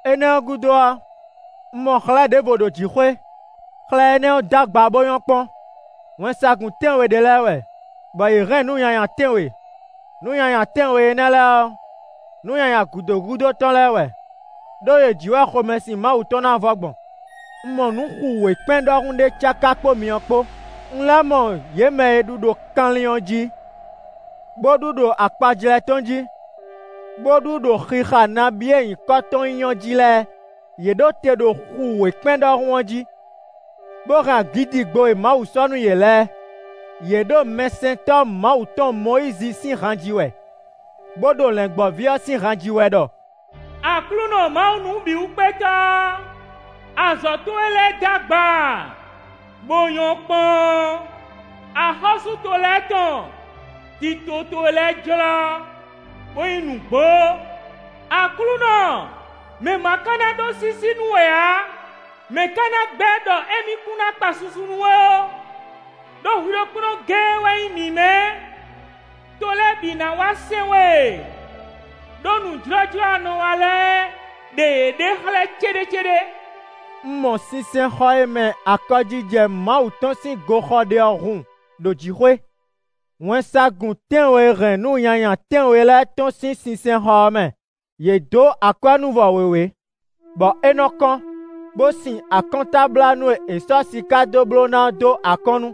Énɛ́ ɔ́ gúdo ɔ́, un mɔ xlɛ́ ɖěvo ɖo jǐxwé; xlɛ́ énɛ́ ɔ́ d'agba bó nyɔ́ kpɔ́n: wɛnsagun tɛ́nwe ɖé lɛ́ɛ wɛ, bɔ yě hɛn nǔ nyanya tɛ́nwe. Nǔ nyanya tɛ́nwe énɛ́ lɛ́ɛ ɔ́, nǔ nyanya gǔdo gúdo tɔn lɛ́ɛ wɛ; ɖó yě jí wɛ xomɛsin Mawu tɔn ná vɔ gbɔn. Un mɔ nǔ xu wěkpɛ́n ɖɔhun ɖé cáká kpó myɔ kpó; un lɛ́ mɔ yě mɛ e ɖu ɖo kanlin ɔ́ jí, bó ɖu ɖo akpajlɛ́ tɔn jí, bó ɖu ɖo xixa nabí e nyǐkɔ tɔn nyí ɔ́ jí lɛ́ɛ. Yě ɖo te ɖo xu wěkpɛ́n ɖɔhun ɔ́ jí, bó hɛn agǐdigbo e Mawu sɔ́ nú yě lɛ́ɛ. Yě ɖo mɛsɛntɔ́ Mawu tɔn Mɔyízi sín han ji wɛ, bó ɖo Lɛ̌ngbɔ́ví ɔ́ sín han ji wɛ ɖɔ: “Aklúnɔ Mawu Nǔbǐwúkpétɔ́, azɔ̌ towe lɛ́ɛ d'agba bó nyɔ́ kpɔ́n. Axɔ́sú to lɛ́ɛ tɔn, tito towe lɛ́ɛ jlɔ́ bó nyí nǔgbó. Aklúnɔ, mɛ̌ ma ká ná ɖó sísí nú we ǎ? Mɛ̌ ka ná gbɛ́ ɖɔ émí kún ná kpa susu nú we ó? Đó hwi ɖokpónɔ géé wɛ nyí mǐmɛ́; to lɛ́ɛ bǐ ná wá sɛn we. Đó nǔ jlɔ́jlɔ́ e a nɔ wa lɛ́ɛ ɖe yěɖée xlɛ́ céɖécéɖé.” Un mɔ sinsɛnxɔ e mɛ akɔjijɛ Mawu tɔn sín goxɔ ɖe ɔ́ hun ɖo jǐxwé. Wɛnsagun tɛ́nwe e hɛn nǔ nyanya tɛ́nwe lɛ́ɛ tɔ́n sín sinsɛnxɔ ɔ́ mɛ; yě dǒ akwɛ́núvɔ wěwé, bɔ é nɔ kɔ́n, bó sin akɔ́ntablánú e è sɔ́ siká dó bló ná ɔ́ dó akɔ́nnu.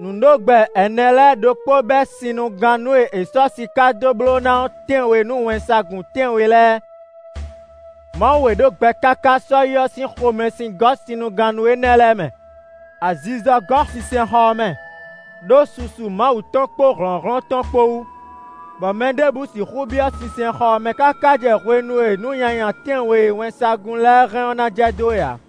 Nǔɖogbɛ ɛnɛ lɛ́ɛ ɖokpó bɛ́ sinnugannú e è sɔ́ siká dó bló ná ɔ́ tɛ́nwe nú wɛnsagun tɛ́nwe lɛ́ɛ; Mawu e ɖo gbɛ káká sɔ́yi ɔ́ sín xomɛsin gɔ́ sinnugannú énɛ́ lɛ́ɛ mɛ. Azizɔ gɔ́ sinsɛnxɔ ɔ́ mɛ, ɖó susu Mawu tɔn kpó hlɔ̌nhlɔ́n tɔn kpó wú, bɔ mɛ ɖěbǔ sixú byɔ́ sinsɛnxɔ ɔ́ mɛ káká jɛ hwenu e nǔ nyanya tɛ́nwe e wɛnsagun lɛ́ɛ hɛn ɔ́ ná jɛ dó é ǎ.